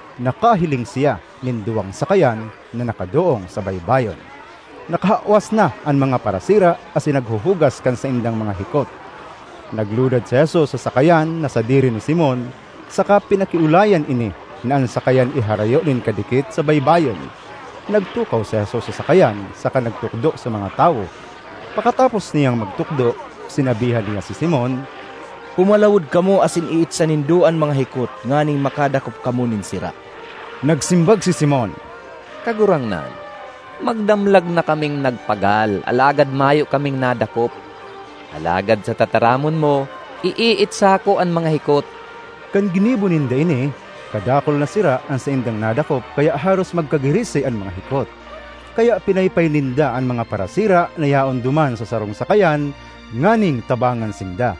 Nakahiling siya nin duwang sakayan na nakadoong sa baybayon; nakahawas na an mga parasira asin naghuhugas kan saindang mga hikot. Naglunad si Jesus sa sakayan na sadiri ni Simon saka pinakiolayan ini na an sakayan iharayo nin kadikit sa baybayon. Nagtukaw si Jesus sa sakayan saka nagtukdo sa mga tawo. Pakatapos niyang magtukdo, sinabihan niya si Simon, “Pumalawod kamo asin iitsa nindo an mga hikot nganing makadakop kamo nin sira.” Nagsimbag si Simon, “Kagurangnan, magdamlag na kaming nagpagal alagad mayo kaming nadakop. Alagad sa tataramon mo, iiitsa ko an mga hikot.” Kan ginibo ninda ini, kadakul na sira an saindang nadakop kaya haros magkagirisi an mga hikot. Kaya pinaypay ninda an mga parasira na yaon duman sa sarong sakayan nganing tabangan sinda.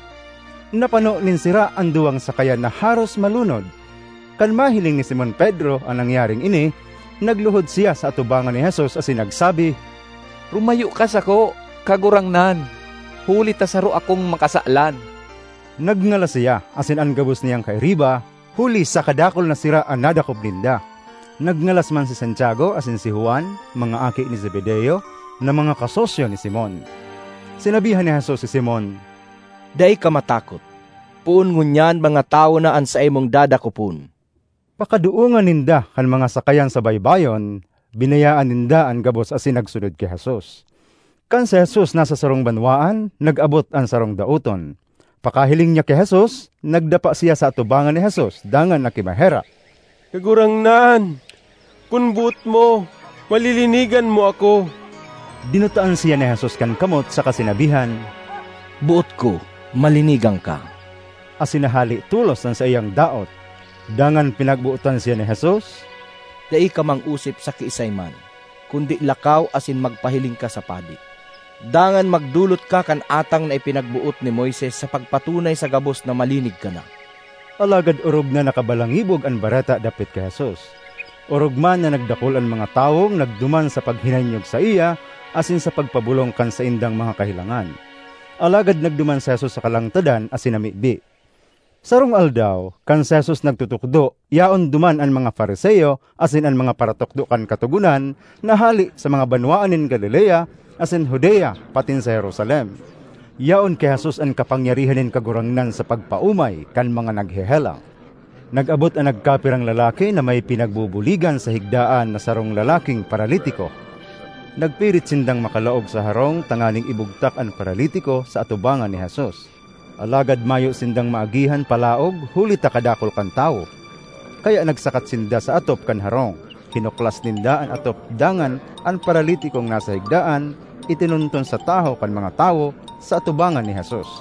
Napano nin sira an duwang sakayan na haros malunod. Kan mahiling ni Simon Pedro an nangyaring ini, nagluhod siya sa atubangan ni Jesus asin nagsabi, “Rumayo ka sako, Kagurangnan, huli ta saro akong makasalan!” Nagngalas siya asin an gabos niyang kairiba huli sa kadakul na sira na nadakop ninda; nagngalas man si Santiago asin si Juan, mga aki ni Zebedeo, na mga kasosyo ni Simon. Sinabihan ni Jesus si Simon, “Dai ka matakot; poon ngunyan mga tawo na an saimong dadakopon.” Pakadoongan ninda kan mga sakayan sa baybayon, binayaan ninda an gabos asin nagsunod ki Jesus. Kan si Jesus nasa sarong banwaan, nag-abot an sarong daoton. Pakahiling niya ki Jesus, nagdapa siya sa atubangan ni Jesus dangan nakimaherak, “Kagurangnan, kun boot mo, malilinigan mo ako!” Dinutaan siya ni Jesus kan kamot saka sinabihan, “Boot ko; malinigan ka!” Asin nahale tolos an saiyang daot. Dangan pinagbotan siya ni Jesus, “Dai ka mangosip sa kiisay man, kundi lakaw asin magpahiling ka sa padi. Dangan magdolot ka kan atang na ipinagboot ni Moises sa pagpatunay sa gabos na malinig ka na.” Alagad orog na nakabalangibog an bareta dapit ki Jesus. Orog man na nagdakul an mga tawong nagduman sa paghinanyog saiya asin sa pagpabolong kan saindang mga kahelangan. Alagad nagduman si Jesus sa kalangtadan asin namibi. Sarong aldaw, kan si Jesus nagtutukdo, yaon duman an mga Fariseo asin an mga paratukdo kan Katogonan na hale sa mga banwaan nin Galilea asin Judea patin sa Jerusalem. Yaon ki Jesus an kapangyarihan nin Kagurangnan sa pagpaomay kan mga naghehelang. Nag-abot an nagkapirang lalaki na may pinagbubuligan sa higdaan na sarong lalaking paralitiko. Nagpirit sindang makalaog sa harong tanganing ibugtak an paralitiko sa atubangan ni Jesus. Alagad mayo sindang maagihan palaog huli ta kadakul kan tawo. Kaya nagsakat sinda sa atop kan harong, hinuklas ninda an atop dangan an paralitikong nasa higdaan itinunton sa tahaw kan mga tawo, sa atubangan ni Jesus.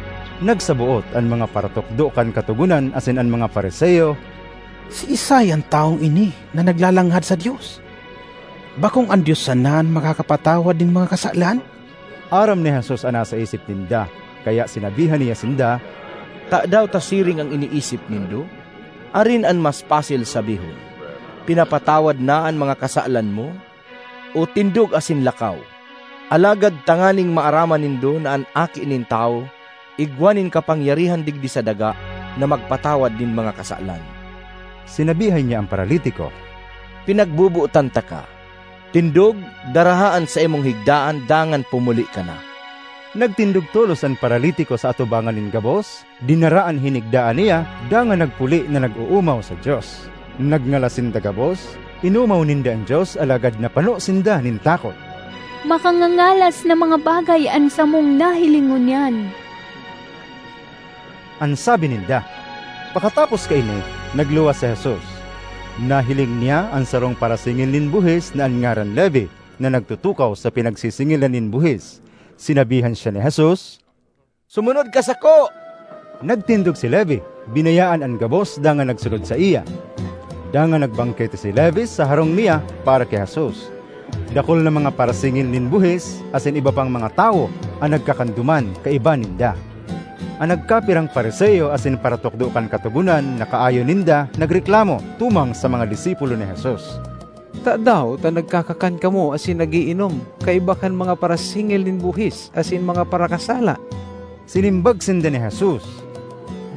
Nagsaboot an mga paratukdo kan Katogonan asin an mga Fariseo, “Siisay an tawong ini na naglalanghad sa Dios? Bakong an Dios sana an makakapatawad nin mga kasalan?” Aram ni Jesus an nasa isip ninda, kaya sinabihan niya sinda, “Tadaw ta siring an iniisip nindo? Arin an mas pasil sabihon, ‘Pinapatawad na an mga kasalan mo,’ o ‘Tindog asin lakaw’? Alagad tanganing maaraman nindo na an Aki nin Tawo igwa nin kapangyarihan digdi sa daga na magpatawad nin mga kasalan,” sinabihan niya an paralitiko, “Pinagbobotan taka: tindog, daraha an saimong higdaan dangan pumuli ka na!” Nagtindog tolos an paralitiko sa atubangan nin gabos, dinara an hinigdaan niya dangan nagpuli na nag-oomaw sa Dios. Nagngalas sinda gabos; inomaw ninda an Dios alagad napano sinda nin takot. “Makangangalas na mga bagay an samong nahiling ngunyan!” an sabi ninda. Pakatapos kaini, nagluwas si Jesus. Nahiling niya an sarong parasingil nin buhis na an ngaran Levi, na nagtutukaw sa pinagsisingilan nin buhis. Sinabihan siya ni Jesus, “Sumunod ka sako.” Nagtindog si Levi, binayaan an gabos dangan nagsunod saiya. Dangan nagbangkete si Levi sa harong niya para ki Jesus. Dakul na mga parasingil nin buhis asin iba pang mga tawo an nagkakan duman kaiba ninda. An nagkapirang Fariseo asin paratukdo kan Katogonan na kaayon ninda nagreklamo tumang sa mga disipulo ni Jesus, “Tadaw ta nagkakakan kamo asin nag-iinom kaiba kan mga parasingil nin buhis asin mga parakasala?” Sinimbag sinda ni Jesus,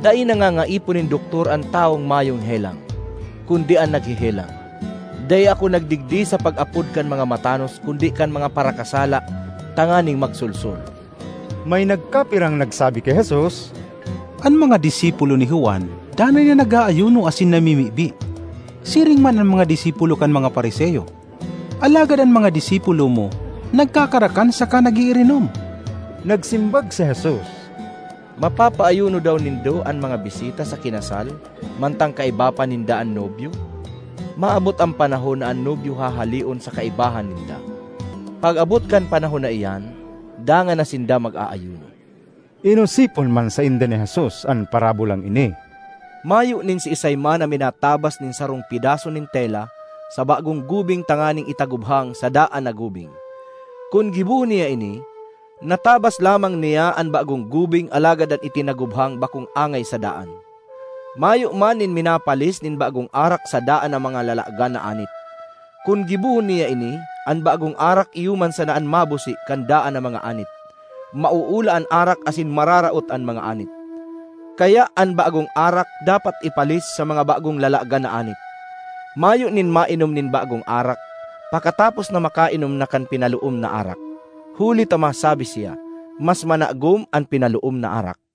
“Dai nangangaipo nin doktor an tawong mayong helang, kundi an naghehelang. Dai ako nagdigdi sa pag-apod kan mga matanos kundi kan mga parakasala tanganing magsolsol.” May nagkapirang nagsabi ki Jesus, “An mga disipulo ni Juan danay na nag-aayuno asin namimibi, siring man an mga disipulo kan mga Fariseo. Alagad an mga disipulo mo nagkakarakan saka nag-iirinom.” Nagsimbag si Jesus, “Mapapaayuno daw nindo an mga bisita sa kinasal mantang kaiba pa ninda an nobyo? Maabot an panahon na an nobyo hahaleon sa kaibahan ninda. Pag-abot kan panahon na iyan, dangan na sinda mag-aayuno.” Inosipon man sainda ni Jesus an parabolang ini, “Mayo nin siisay man na minatabas nin sarong pedaso nin tela sa bagong gubing tanganing itagubhang sa daan na gubing. Kun gibohon niya ini, natabas lamang niya an bagong gubing alagad an itinagubhang bakong angay sa daan. Mayo man nin minapalis nin bagong arak sa daan na mga lalagan na anit. Kun gibohon niya ini, an bagong arak iyo man sana an mabusi kan daan na mga anit, mauula an arak asin mararaot an mga anit. Kaya an bagong arak dapat ipalis sa mga bagong lalagan na anit. Mayo nin mainom nin bagong arak pakatapos na makainom na kan pinaloom na arak, huli ta masabi siya, ‘Mas managom an pinaloom na arak.’”